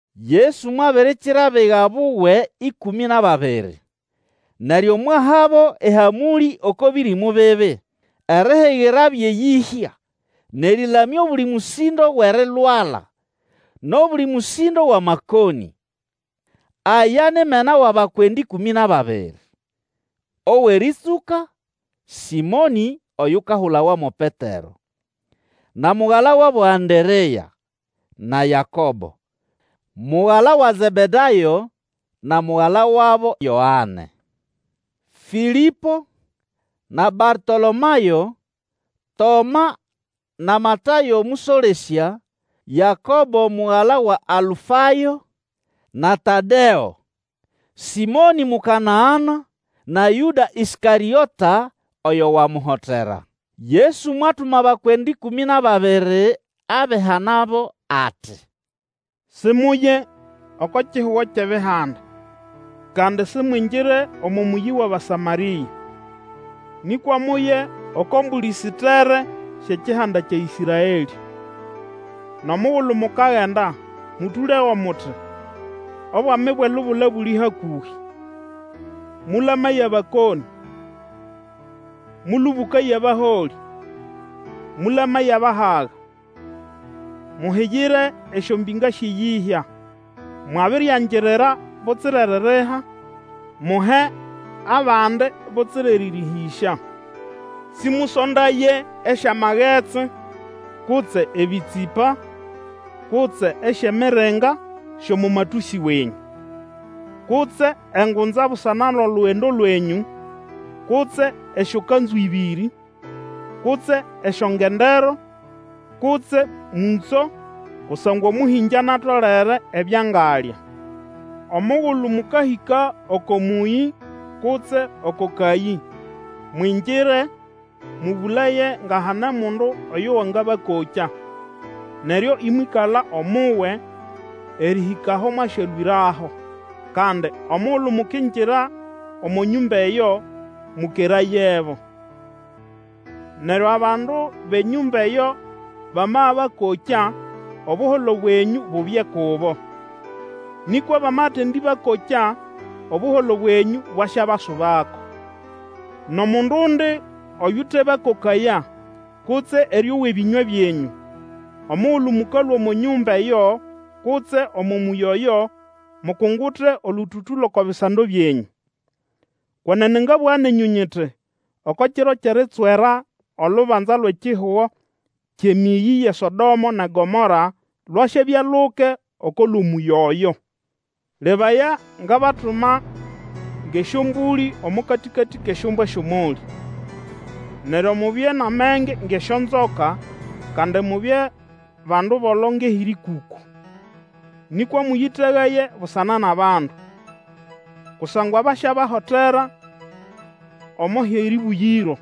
Yesu mwabirikira abiga buwe ĩkũmĩ nʼababiri, neryo mwahabo ehamũlĩ oko bĩrĩmũ bibi, erihigirabyo eyĩhya, nʼerĩlamya obuli mũsĩndo wʼerilwala, nʼobuli mũsĩndo wʼamakonĩ. Aya ni mena wʼabakwenda ĩkũmĩ nʼababiri: owʼerĩtsũka, Sĩmonĩ, oyukahulawa mo Petero, na mugala wabo Anderea; na Yakobo, mugala wa Zebedayo na mugala wabo Yoane; Fĩlĩpo, na Bartolomayo; Toma na Matayo mũsolesya; Yakobo mugala wa Alufayo, na Tadeo; Sĩmonĩ Mukanana, na Yũda Ĩskarĩota, oyo wamuhotera. Yesu mwatuma abakwenda ĩkũmĩ nʼababiri abihanabo, ati, Simuye oko kihugo kyʼEbihanda, kandi simwingire omo mũyi wʼAbasamarĩa. Nĩkwa muye oko mbũlĩ sitere syʼekihanda kya Ĩsraelĩ. Nʼomugulu mukagenda, mũtũlego muti, Obwami bwʼelubula buli hakũhĩ. Mũlamaye abakonĩ, mũlũbũkaye abaholĩ, mũlamaye abahaga, muhigire esyombĩnga syʼeyĩhya. Mwabiryangirira butsira eririha, muhe abandi butsira erĩrĩhĩsya. Sĩmũsondaye esyamagetsi, kutse ebĩtsĩpa, kutse esyʼemiringa syʼomo matũsĩ wenyũ; kutse engunza busana nʼolugendo lwenyũ, kutse esyokanzu ĩbĩrĩ, kutse esyongendero, kutse mũtso; kusangwa omũhĩngĩ anatolere ebyo angalya. Omugulu mũkahĩka oko mũyĩ kutse oko kayĩ, mwingire, mũbũlaye nga hane mundu oyo wangabakokya, neryo imwĩkala omuwe, erĩhĩka aho mwasyalũĩraho. Kandi omugulu mukingira omo nyũmba eyo, mũkerayebo. Neryo abandu bʼenyũmba eyo bamabakokya, Obuholo bwenyũ bubye kubo; nĩkwa bamatendĩbakokya, Obuholo bwenyũ ibwabasubako. Nʼomundundi oyutebakokaya, kutse erĩowa ebĩnywa byenyũ, omugulu mũkalũa omo nyũmba eyo kutse omo mũyĩ oyo, mukungute olũtũtũ lʼoko bisando byenyũ. Kwenene ngabũga nenyũ nyiti, Oko kiro kyʼeritswera, olubanza lwʼekihugo kyʼemĩyĩ yʼeSodomo nʼeGomoro lwasyabya luke oko lʼomũyĩ oyo. Lebaya, ngabatuma ngʼesyombũlĩ omo katĩkatĩ kʼesyombwa syʼomolĩ. Neryo mubye nʼamenge ngʼesyonzoka, kandi mubye bandu bolo ngʼehĩrĩkũkũ. Nĩkwa mũyĩtegaye busana nʼabandu; kusangwa basyabahotera omo hʼerĩbũgĩro,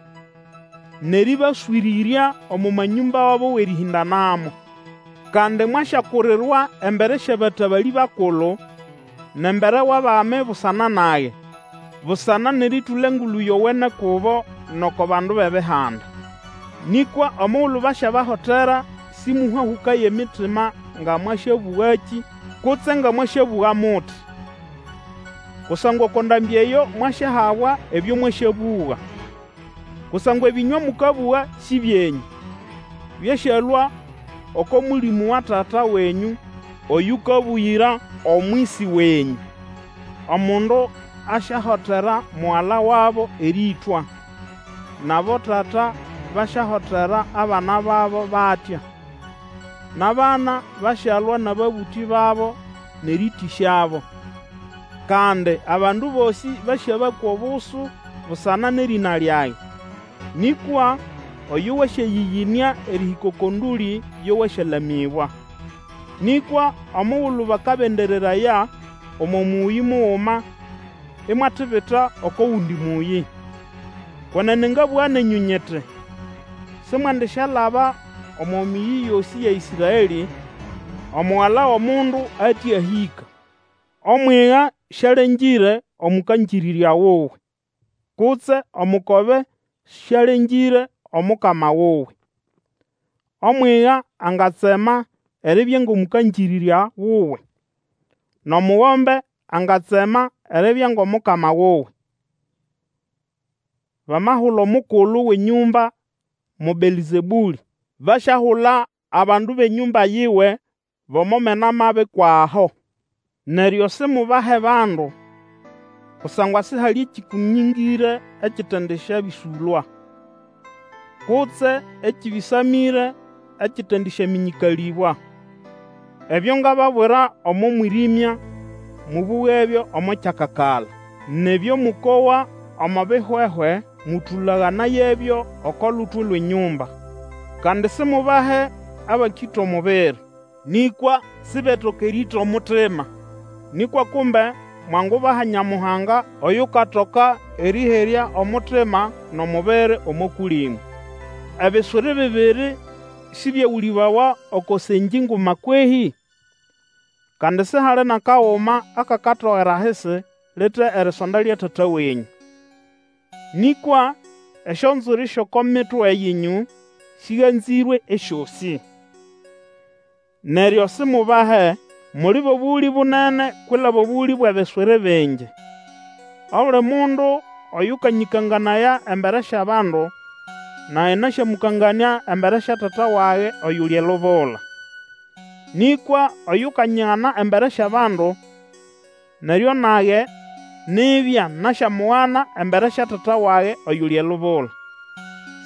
nʼerĩbaswĩrĩrya omo manyũmba wabo wʼerĩhĩndanamo. Kandi, mwasyakurirwa embere syʼabatabalĩ bakulu, nʼembere wʼabami busana nage, busana nʼerĩtũla Engulu Yowene kubo, nʼoko bandu bʼEbihanda. Nĩkwa omugulu basyabahotera, sĩmũhahũkaye emitima nga mwasyabũgakĩ kutse nga mwasyabũga muti. Kusangwa oko ndambĩ eyo mwasyahabwa ebyo mwasyabũga. Kusangwa ebĩnywa mũkabũga sĩ byenyũ; byasyalũa oko Mũlĩmũ wa Tata wenyũ oyũkabũgĩra omwisi wenyũ. Omundu asyahotera mugala wabo erĩĩtwa, nʼabotata basyahotera abana babo batya; nʼabana basyalwa nʼababũtĩ babo nʼerĩĩtĩsyabo. Kandi abandu bosĩ basyabakwa obusu busana nʼerĩna lyage. Nĩkwa oyo wasyayĩyĩnĩa erĩhĩka oko ndũlĩ yo wasyalamĩbwa. Nĩkwa omugulu bakabendereraya omo mũyĩ muguma imwatibita oko gundi mũyĩ. Kwenene ngabũga nenyũ nyiti, Simwendisyalaba omo mĩyĩ yosĩ ya Ĩsraelĩ, Omugala wʼomundu ate ahĩka. Omwiga sialengĩre omũkangĩrĩrya wuwe, kutse omukobe sialengĩre omukama wuwe. Omwiga angatsema eribya ngʼomũkangĩrĩrya wuwe, nʼomugombe angatsema eribya ngʼomukama wuwe. Bamahula omukulu wʼenyũmba mo Belzebũlĩ, basyahula abandu bʼenyũmba yiwe bʼomo mena mabi kwʼaho! Twangubahandi? Neryo simubahe abandu. Kusangwa sihali ekĩkũnĩngĩre ekitendisyabĩsũlwa, kutse ekĩbĩsamĩre ekitendisyamĩnyĩkalĩbwa. Ebyo ngababwira omo mwĩrĩmya, mũbũgebyo omo kyakakala; nʼebyo mũkowa omo bihwehwe mũtũlaganayebyo oko lutwe lwʼenyũmba. Kandi simubahe abakĩta omubiri, nĩkwa sibetoka erĩĩta omutima; nĩkwa kumbe mwangubaha Nyamuhanga oyukatoka erĩherya omutima nʼomubiri omo Kũlĩmũ. Ebiswiri bibiri sibyegũlĩbawa oko sengĩ nguma kwehĩ? Kandi sihali nʼakaguma akakatogera ahisi lite erisonda lya Tata wenyũ. Nĩkwa esyonzwiri syʼoko mitwe yenyũ sĩganzĩrwe esyosĩ. Neryo simubahe, muli bʼobũgũlĩ bunene kwilaba obũgũlĩ bwʼebiswiri bingi! Obuli mundu oyũkanyĩkanganaya embere syʼabandu, nage nasyamũkanganĩa embere sya Tata wage oyuli elubula. Nĩkwa oyukanyigana embere syʼabandu, neryo nage nibya nasyamugana embere sya Tata wage oyuli elubula.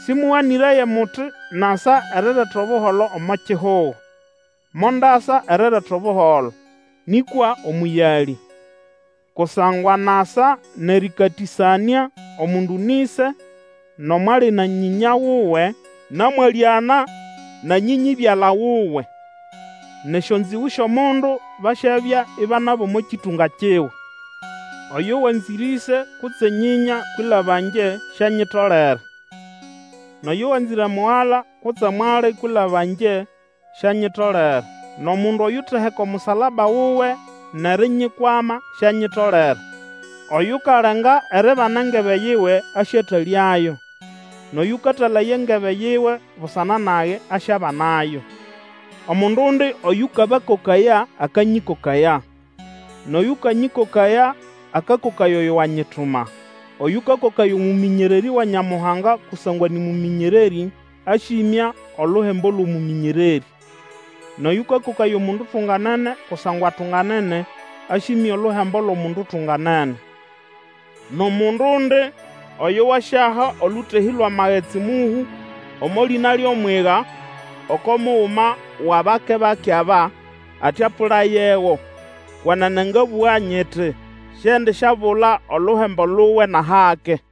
Sĩmũganĩraye muti nasa nʼerireta Obuholo omo kihugo; mondasa erireta Obuholo, nĩkwa omũyalĩ. Kusangwa nasa nʼerĩkatĩsanĩa omundu nʼĩse, nʼomwali na nyĩnya wuwe, na mwalĩana na nyĩnyĩ-byala wuwe. Nʼesyonzĩgũ syʼomundu basyabya iba nʼabʼomo kĩtũnga kiwe. Oyo wanzĩre ĩse kutse nyĩnya kwilaba ngye sianyitolere; nʼoyo wanzĩre mugala kutse mwali kwilaba ngye, sianyitolere. Nʼomundu oyuteheka omusalaba wuwe nʼerinyikwama sianyitolere. Oyukalenga eribana engebe yiwe, asyatalyayo, nʼoyũkatalaya engebe yiwe busana nage asyabanayo. Omundundi oyũkabakokaya akanyĩkokaya; nʼoyũkanyĩkokaya akakokaya oyo wanyituma. Oyũkakokaya omũmĩnyererĩ wa Nyamuhanga kusangwa nĩ mũmĩnyererĩ asyĩmya oluhembo lwʼomũmĩnyererĩ; nʼoyũkakokaya omundu utunganene kusangwa atunganene, asyĩmya oluhembo lwʼomundu utunganene. Nʼomundundi oyo wasyaha olũtehĩ lwʼamagetsi mũhũ omo lĩna lyʼomwiga oko muguma wʼabake-bake aba ati apũlayego, kwenene ngabũga nyiti, siendisyabula oluhembo luwe nʼahake.